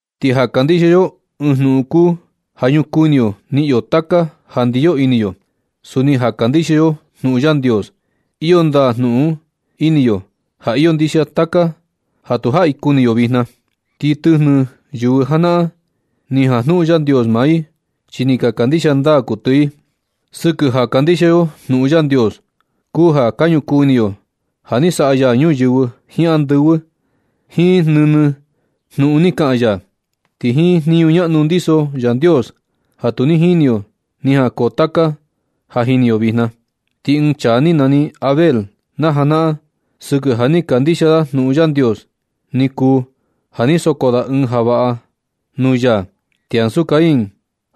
Ti ja kandixia yo ɨɨn jnuꞌun kuu ja ñukuu ini yo niꞌin yo taka ja ndiyo ini yo. Suni ja kandixia yo jnuꞌun Yandios iyo ndaa jnuꞌun un ini yo ja iyo ndixia taka ja tu jaꞌi kuni yo vijna. Ti tɨjnɨ yɨvɨ janaꞌan, ni jajnuꞌun Yandios maa i chi ni ka kandixia ndaa kuɨtɨ i. Sɨkɨ ja kandixia yo jnuꞌun Yandios kuu ja ka ñukuu ini yo ja ni saꞌa ya ñuyɨvɨ jiin andɨvɨ, jiin nɨnɨ jnuꞌun ni kaꞌan ya. Ti jiin jniñu ñaꞌnu ndiso Yandios ja tu ni jini yo, ni jankoo taka ja jini yo vijna. Ti ɨɨn chaa ni nani Abel najanaꞌan sɨkɨ ja ni kandixia da jnuꞌun Yandios, ni kuu ja ni soko da ɨɨn ja vaꞌa ga nuu ya ti ansu Caín.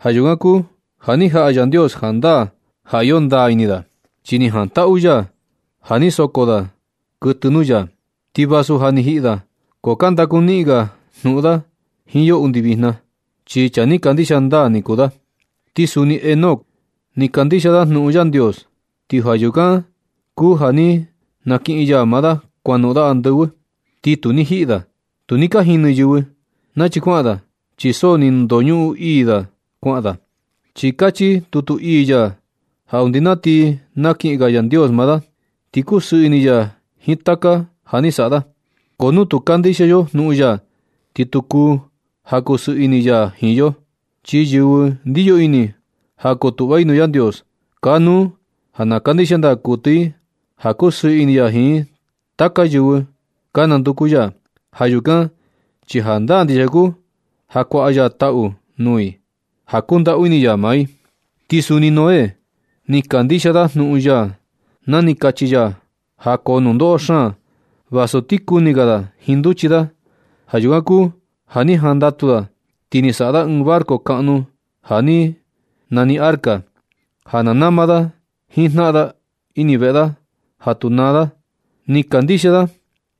Ja yukan kuu ja ni jaꞌa Yandios jandaa ja iyo ndaa ini da, chi ni jantaꞌu ya ja ni soko da kuɨtɨ nuu ya. Ti vasu ja ni jiꞌi da, ko ka ndakuniꞌin ga ya jnuꞌun da jiin yo undi vijna, chi chaa ni kandixia ndaa ni kuu da. Ti suni Enoc ni kandixia da jnuꞌun Yandios, ti ja yukan kuu ja ni nakiꞌin ya maa da kuanoꞌon da andɨvɨ, ti tu ni jiꞌi da. Tu ni ka jini yɨvɨ nachi kuaꞌan da chi so ni ndoñuꞌun ii da kuaꞌan da, chi kachi tutu ii ya ja undi na ti nakiꞌin ga Yandios maa da ni kusɨɨ ini ya jiin taka ja ni saꞌa da. Ko nu tu kandixia yo jnuꞌun ya, ti tu kuu ja kusɨɨ ini ya jiin yo. Chi yɨvɨ ndiyo ini ja kotuꞌva i nuu Yandios, kanuu ja na kandixia ndaa kuɨtɨ i ja kusɨɨ ini ya jiin taka yɨvɨ ka nanduku ya. Ja yukan chi jandaa ndixia kuu ja kuaꞌa ya taꞌu nuu i ja kundaꞌu ini ya maa i. Ti suni Noé, ni kandixia da jnuꞌun ya na ni kachi ya ja koo nundoꞌo xaan vasu ti kuni ga da jiin nduchi da. Ja yukan kuu ja ni jandatu da ti ni saꞌa da ɨɨn barco kaꞌnu ja nani arca, ja na nama da nɨɨ jnaꞌan da ini veꞌe ja tu naa i. Ni kandixia da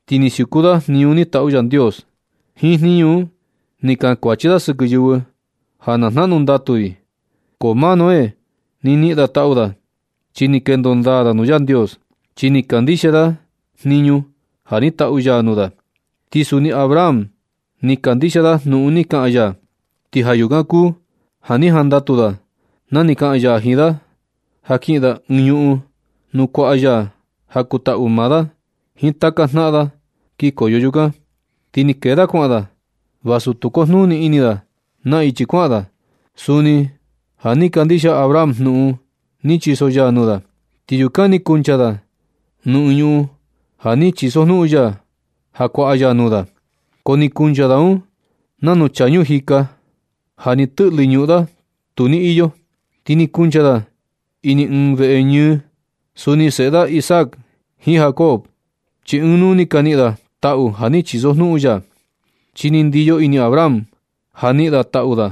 ti ni siuku da jniñu ni taꞌu Yandios. Jiin jniñu un ni kankuachi da sɨkɨ yɨvɨ ja na jnaꞌnu ndatu i. Ko maa Noé, ni niꞌin da taꞌu da chi ni kendo ndaa da nuu Yandios, chi ni kandixia da jniñu ja ni taꞌu ya nuu da. Ti suni Abraham, ni kandixia da jnuꞌun ni kaꞌan ya, ti ja yukan kuu ja ni jantaꞌu da na ni kaꞌan ya jiin da ja kiꞌin da ɨɨn ñuꞌun nuu kuaꞌa ya ja kuu taꞌu maa da jiin taka jnaꞌan da kikoyo yukan. Ti ni kee da kuaꞌan da vasu tu kujnuni ini da naa ichi kuaꞌan da. Suni ja ni kandixia Abraham jnuꞌun ni chiso ya nuu da, ti yukan ni kuncha da nuu ɨɨn ñuꞌun ja ni chisojnuꞌun ya ja kuaꞌa ya nuu da, ko ni kuncha da un nanu chaa ñuu jika ja ni tɨꞌlɨ ñuꞌun da tu ni iyo. Ti ni kuncha da ini ɨɨn veꞌe ñɨɨ, suni seꞌe da Isaac jiin Jacob, chi ɨɨn nuu ni ka niꞌin da taꞌu ja ni chisojnuꞌun ya. Chi ni ndiyo ini Abraham ja niꞌin da taꞌu da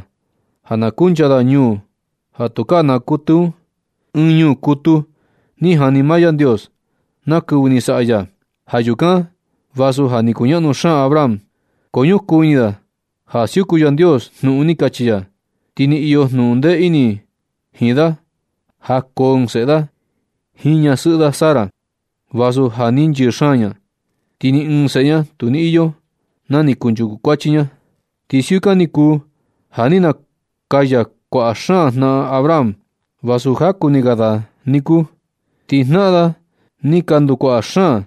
ja na kuncha da ñuu ja tukaa naa kuɨtɨ un, ɨɨn ñuu ja kutu ni jani maa Yandios na kɨvɨ ni saꞌa ya. Ja yukan, vasu ja ni kuñaꞌnu xaan Abraham, ko ñukuu ini da ja siuku Yandios jnuꞌun ni kachi ya. Ti ni iyo jnuꞌun ndee ini jiin da ja koo ɨɨn seꞌe da jiin ñasɨꞌɨ da Sara, vasu ja ni nchɨɨ xaan ña, ti ni ɨɨn seꞌe ña tu ni iyo na ni kunchuku kuachi ña. Ti siukan ni kuu ja ni nakaya kuaꞌa xaan jnaꞌan Abraham vasu jaku ni ga na da niku. Ti jnaꞌan da ni ka ndukuaꞌa xaan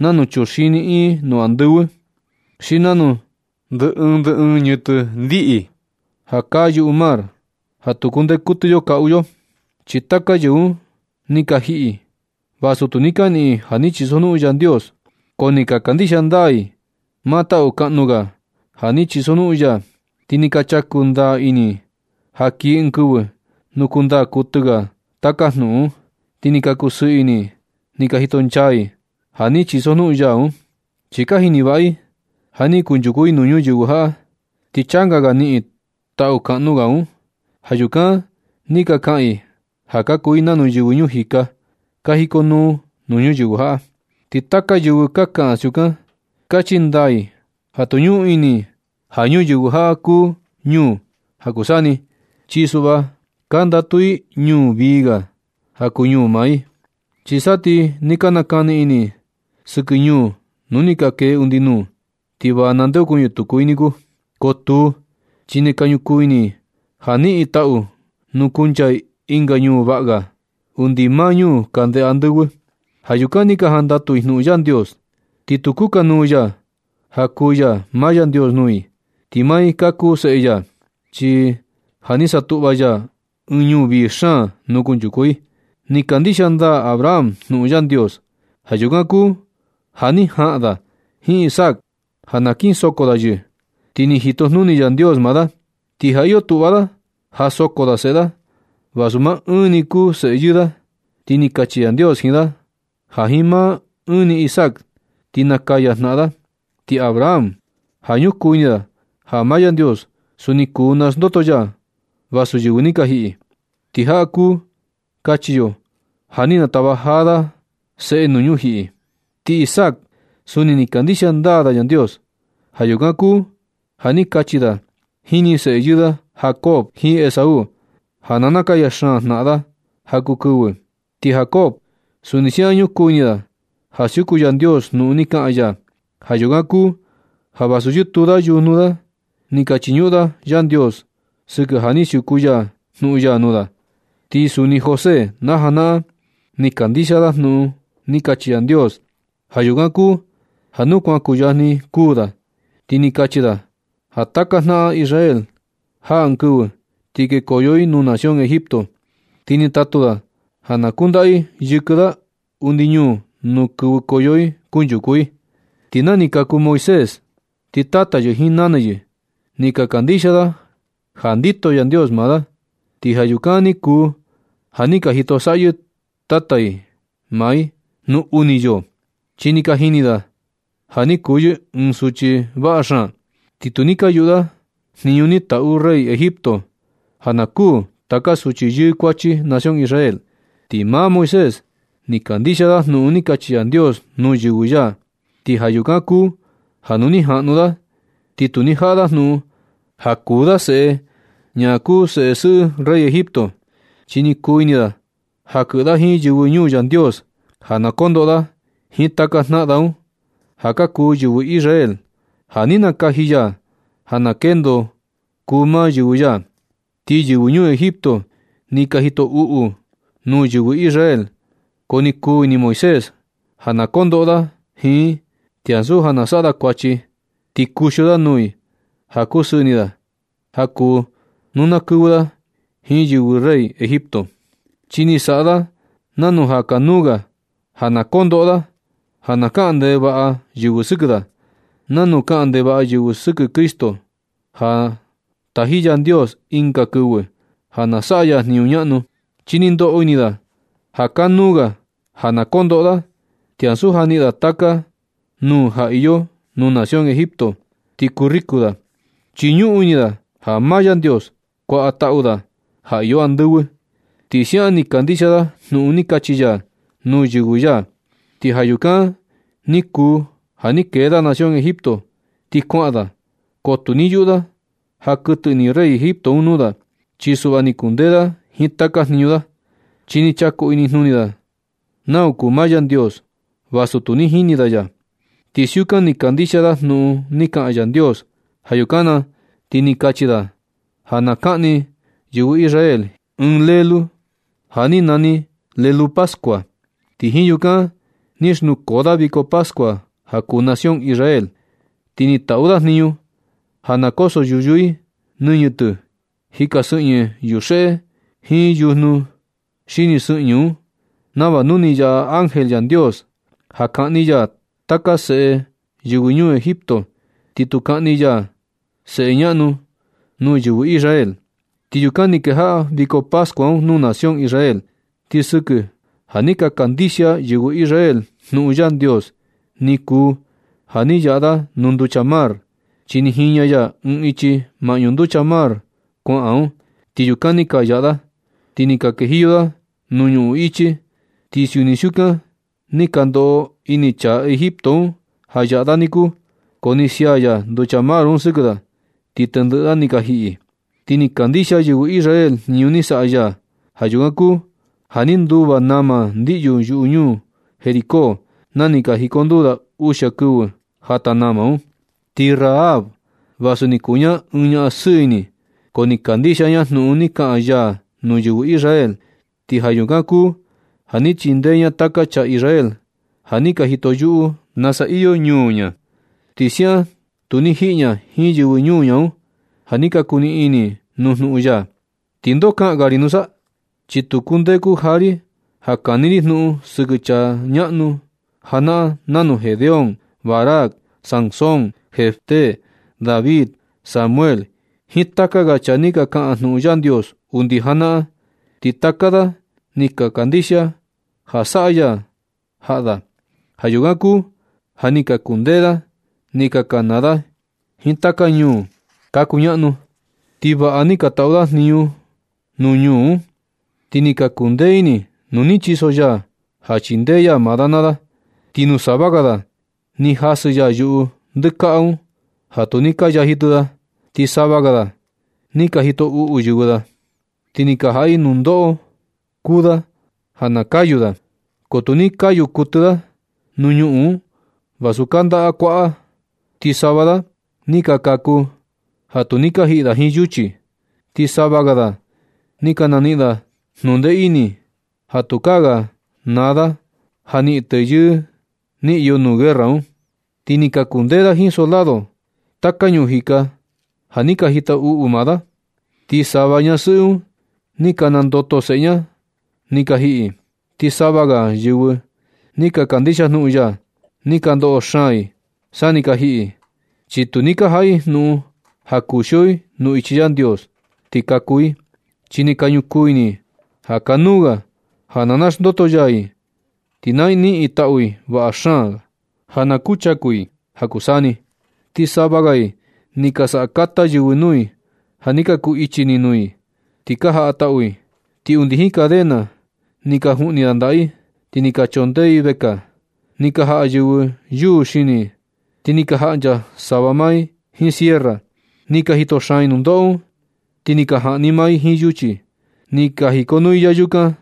nanu chuxini iin nuu andɨvɨ, xi nanu ndɨ ɨɨn ndɨ ɨɨn ñɨtɨ ndiꞌi ja kaa yuꞌu mar ja tu kundee kuɨtɨ yo kaꞌu yo. Ti taka yɨvɨ un ni ka jiꞌi yɨ, vasu tu ni ka niꞌin i ja ni chisojnuꞌun Yandios, ko ni ka kandixia ndaa i maa taꞌu kaꞌnu ga ja ni chisojnuꞌun ya, ti ni ka chaku ndaa ini i ja kii ɨɨn kɨvɨ nuu kuu ndaa kuɨtɨ ga taka jnuꞌun un. Ti ni ka kusɨɨ ini i ni ka jito nchaa i ja ni chisojnuꞌun ya un. Chi ka jini vaꞌa i ja na ni kunchuku i nuu ñuyɨvɨ jaꞌa, ti changa ga niꞌin i taꞌu kaꞌnu ga un. Ja yukan ni ka kaꞌan i ja ka kuu i nanu yɨvɨ ñuu jika ka jikonuu nuu ñuyɨvɨ jaꞌa. Ti taka yɨvɨ ja kaꞌan siukan, chi kachi ndaa i ja tu ñuꞌun ini i ja ñuyɨvɨ jaꞌa kuu ñuu i ja kuu saa ni. Chi suꞌva ka ndatu i ɨɨn ñuu vii ga ja kuu ñuu maa i. Chi sa ti ni ka nakani ini i sɨkɨ ñuu nuu ni ka kee undi nuu, ti va nandeokuñɨ tuku i niku. Ko tuu, chi ka ñukuu ini i ja niꞌin i taꞌu nuu kuncha i ɨnga ñuu vaꞌa ga undi maa ñuu kande andɨvɨ. Ja yukan ni ka jandatu i jnuꞌun Yandios, ti tu kukanuu ya ja kuu ya maa Yandios nuu i, ti maa i ka kuu seꞌe ya, chi ja ni satuꞌva ya ɨɨn ñuu vii xaan nuu kunchuku i. Ni kandixia ndaa Abraham jnuꞌun Yandios. Ja yukan kuu ja ni jaꞌan da jiin Isaac ja na kin soko da yɨ, ti ni jito jnuni Yandios maa da. Ti ja iyo tuꞌva da ja soko da seꞌe da, vasu maa ɨɨn ni i kuu seꞌe yɨɨ da. Ti ni kachi Yandios jiin da ja jiin maa ɨɨn ni Isaac, ti nakaya janaꞌan da. Ti Abraham, ja ñukuu ini da ja maa Yandios suni kuu naxndoto ya vasu yɨvɨ ni ka jiꞌi, (ti jaꞌa kuu kachi yo ja ni natava jaa da seꞌe nuu ñujiꞌi un.) Ti Isaac, suni ni kandixia ndaa da Yandios. Ja yukan kuu ja ni kachi da jini seꞌe yɨɨ da Jacob jiin Esaú ja nakaya xaan jnaꞌan da ja kuu kɨvɨ. Ti Jacob, suni siaꞌan ñukuu ini da ja siuku Yandios jnuꞌun ni kaꞌan ya. Ja yukan kuu ja vasu yɨtuu da yujnu da ni ka chiñuꞌun da Yandios sɨkɨ ja ni siuku ya jnuꞌun ya nuu da. Ti suni José, na janaꞌan ni kandixia da jnuꞌun ni kachi Yandios. Ja yukan kuu ja nu kuan kuyajni kuū da, ti ni kachi da ja taka jnaꞌan Israel, jaa ɨɨn kɨvɨ ti kekoyo i nuu nación Egipto. Ti ni tatu da ja na kundaꞌa i yɨkɨ da undi ñuu nuu kɨvɨkoyo i kunchuku i. Ti na ni kaku Moisés, ti tata yɨ jiin nana yɨ ni ka kandixia da ja ndito Yandios maa i. Ti ja yukan ni kuu ja ni ka jito saꞌyɨ tata i maa i nuu uni yoo, chi ni ka jini da ja ni kuu yɨ ɨɨn suchi vaꞌa xaan. Ti tu ni ka yuꞌu da jniñu ni taꞌu rey Egipto un ja na kuū taka suchi yɨɨ kuachi nación Israel. Ti maa Moisés ni kandixia da jnuꞌun ni kachi Yandios nuu yɨvɨ ya. Ti ja yukan kuu ja nu ni jaꞌnu da, ti tu ni jaꞌa da jnuꞌun ja kuu da seꞌe ñaꞌan kuu seꞌe sɨꞌɨ rey Egipto. Chi ni kuu ini da ja kɨꞌɨ da jiin yɨvɨ ñuu Yandios ja na kondoꞌo da jiin taka jnaꞌan da un, ja ka kuu yɨvɨ Israel ja ni nakaji ya ja na kendo kuu maa yɨvɨ ya. Ti yɨvɨ ñuu Egipto ni ka jito uꞌu nuu yɨvɨ Israel, ko ni kuu ini Moisés ja na kondoꞌo da jiin i, ti ansu ja na saꞌa da kuachi. Ti kuxio da nuu i ja kusɨɨ ini da ja kuu nu na kɨvɨ da jiin yɨvɨ rey Egipto. Chi ni saꞌa da nanu ja kanuu ga ja na kondoꞌo da, ja na kaꞌan ndevaꞌa yɨvɨ sɨkɨ da, nanu kaꞌan ndevaꞌa yɨvɨ sɨkɨ Cristo ja taji Yandios ɨnga kɨvɨ ja na saꞌa ya jniñu ñaꞌnu. Chi ni ndoꞌo ini da ja kanuu ga ja na kondoꞌo da, ti ansu ja niꞌin da taka nuu ja iyo nuu nación Egipto ti kuu riku da. Chi ñuꞌun ini da ja maa Yandios kuaꞌa taꞌu da ja iyo andɨvɨ. Ti siaꞌan ni kandixia da jnuꞌun ni kachi ya nuu yɨvɨ ya, ti ja yukan ni kuu ja ni kee da nación Egipto ti kuaꞌan da. Ko tu ni yuꞌu da ja kuɨtɨ ini rey Egipto un nuu da. Chi suꞌva ni kundee da jiin taka jniñu da, chi ni chaku inijnuni da nau kuu maa Yandios vasu tu ni jini da ya. Ti siukan ni kandixia da jnuꞌun ni kaꞌan Yandios. Ja yukan na ti ni kachi da ja na kaꞌni yɨvɨ Israel ɨɨn lelu, ja ni nani lelu pascua. Ti jiin yukan ni xnukoo da viko pascua ja kuu nación Israel. Ti ni taꞌu da jniñu ja na koso yuyu i nɨñɨ tɨ jika sɨꞌñɨ yuxeꞌe jiin yujnu xini sɨꞌñɨ un, nava nu ni yaꞌa ángel Yandios ja kaꞌni ya taka seꞌe yɨvɨ ñuu Egipto, ti tu kaꞌni ya seꞌe ñaꞌnu nuu yɨvɨ Israel. Ti yukan ni kejaꞌa viko pascua un nuu nación Israel. Ti sɨkɨ ja ni ka kandixia yɨvɨ Israel jnuꞌun Yandios ni kuu ja ni ka yaꞌa da nuu nducha mar, chi ni jiña ya ɨɨn ichi maꞌñu nducha Mar Kuaꞌa un, ti yukan ni ka yaꞌa da, ti ni ka kejiyo da nuu ñuꞌun ichi. Ti suni siukan ni ka ndoꞌo ini chaa Egipto un ja yaꞌa da niku. Ko ni nasia ya nducha mar un sɨkɨ da, ti tendɨꞌɨ da ni ka jiꞌi. Ti ni kandixia yɨvɨ Israel jniñu ni saꞌa ya. Ja yukan kuu ja ni nduva nama ndiꞌyu yuꞌu ñuu Jericó, na ni ka jikonduu da uxia kɨvɨ jata nama un. Ti Rahab, vasu ni kuu ña ɨɨn ñaꞌan sɨɨ ini, ko ni kandixia ña jnuꞌun ni kaꞌan ya nuu yɨvɨ Israel. Ti ja yukan kuu ja ni chindee ña taka chaa Israel ja ni ka jito yuꞌu nasa iyo ñuu ña. Ti siaꞌan tu ni jiꞌi ña jiin yɨvɨ ñuu ña un, ja ni ka kuu niꞌin ini i nuu jnuꞌun ya. ¿Ti ndo kaꞌan ga ri nusa? Chi tu kundee kuja ri ja kani ri jnuꞌun sɨkɨ chaa ñaꞌnu janaꞌan nanu Gedeón, Barac, Sansón, Jefté, David, Samuel jiin taka ga chaa ni ka kaꞌan jnuꞌun Yandios undi najanaꞌan. Ti taka da ni ka kandixia ja saꞌa ya jaꞌa da. Ja yukan kuu ja ni ka kundee da ni ka kanaa da jiin taka ñuu ka kuñaꞌnu, ti vaꞌa ni ka taꞌu da jniñu nuu ñuu un. Ti ni ka kuu ndee ini nu ni chiso ya ja chindee ya maa da naa da. Ti nuu sava ga da, ni jasɨ ya yuꞌu ndɨkaꞌa un ja tu ni ka yaji tɨ da. Ti sava ga da, ni ka jito uꞌu yɨvɨ da, ti ni ka jaꞌa i ɨɨn nundoꞌo kuu da ja na kayu da, ko tu ni ka kayu kuɨtɨ da nuu ñuꞌun un vasu kanda kuaꞌan, ti sava da ni ka kaku ja tu ni ka jiꞌi da jiin yuchi. Ti sava ga da ni ka naniꞌin ndee ini da ja tukaa ga naa da ja niꞌin teyɨɨ ni iyo nuu guerra un, ti ni ka kundee da jiin soldado taka ñuu jika un ja ni ka jito uꞌu maa da. Ti sava ñasɨꞌɨ un, ni ka nandoto seꞌe ña na ni ka jiꞌi i. Ti sava ga yɨvɨ ni ka kandixia jnuꞌun ya, ni ka ndoꞌo xaan i sa ni ka jiꞌi i, chi tu ni ka jaꞌa i jnuꞌun ja kuxio i nuu ichi Yandios ti kaku i, chi ni ka ñukuu ini i ja kanuu ga ja na naxndoto ya i ti na niꞌin i taꞌu vaꞌa xaan ga ja na kuchaku i ja kuu saa ni. Ti sava ga i ni ka saꞌa kata yɨvɨ nuu i ja ni ka kuu ichi ini nuu i, ni ka jaꞌa tau i. Ti undi jiin cadena ni ka juꞌni ndaꞌa i, ti ni ka chondee i vekaa. Ni ka jaꞌa yɨvɨ yuu xini i, ti ni ka jaꞌnchaa sava maa i jiin sierra, ni ka jito xaan i nundoꞌo un. Ti ni ka jaꞌni maa i jiin yuchi. Ni ka jikonuu i yayukan,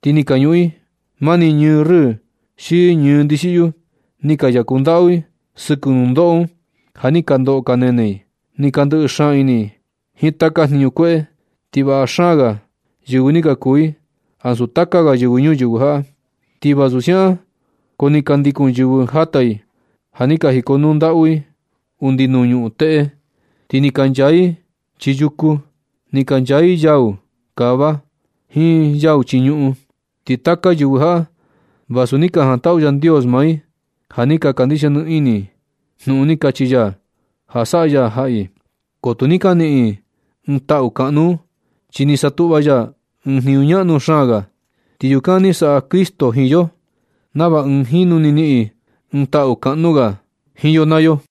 ti ni ka ñuꞌun i mani ñɨɨ rɨɨ jiin ñɨɨ ndixiꞌyu. Ni ka yaku ndaꞌu i sɨkɨ nundoꞌo un ja ni ka ndoꞌo ka nene i. Ni ka ndɨꞌɨ xaan ini i jiin taka jniñu kueꞌe. Ti vaꞌa xaan ga yɨvɨ ni ka kuu i ansu taka ga yɨvɨ ñuyɨvɨ jaꞌa. Ti vasu siukan ko ni ka ndikun yɨvɨ jata i ja ni ka jikonuu ndaꞌu i undi nuu ñuꞌun teꞌe. Ti ni ka nchaa i chii yuku. Ni ka nchaa i yau kava jiin yau chii ñuꞌun. Ti taka yɨvɨ jaꞌa, vasu ni jantaꞌu Yandios maa i ja ni kandixia nɨ ini i jnuꞌun ni kachi ya ja saꞌa ya jaꞌa i. Ko tu ni ka niꞌin i ɨɨn taꞌu kaꞌnu un. Chi ni satuꞌva ya ɨɨn jniñu ñaꞌnu xaan ga, ti yukan ni saꞌa Cristo jiin yo, nava ɨɨn jinu ni niꞌin i ɨɨn taꞌu kaꞌnu ga jiin yo naa yo.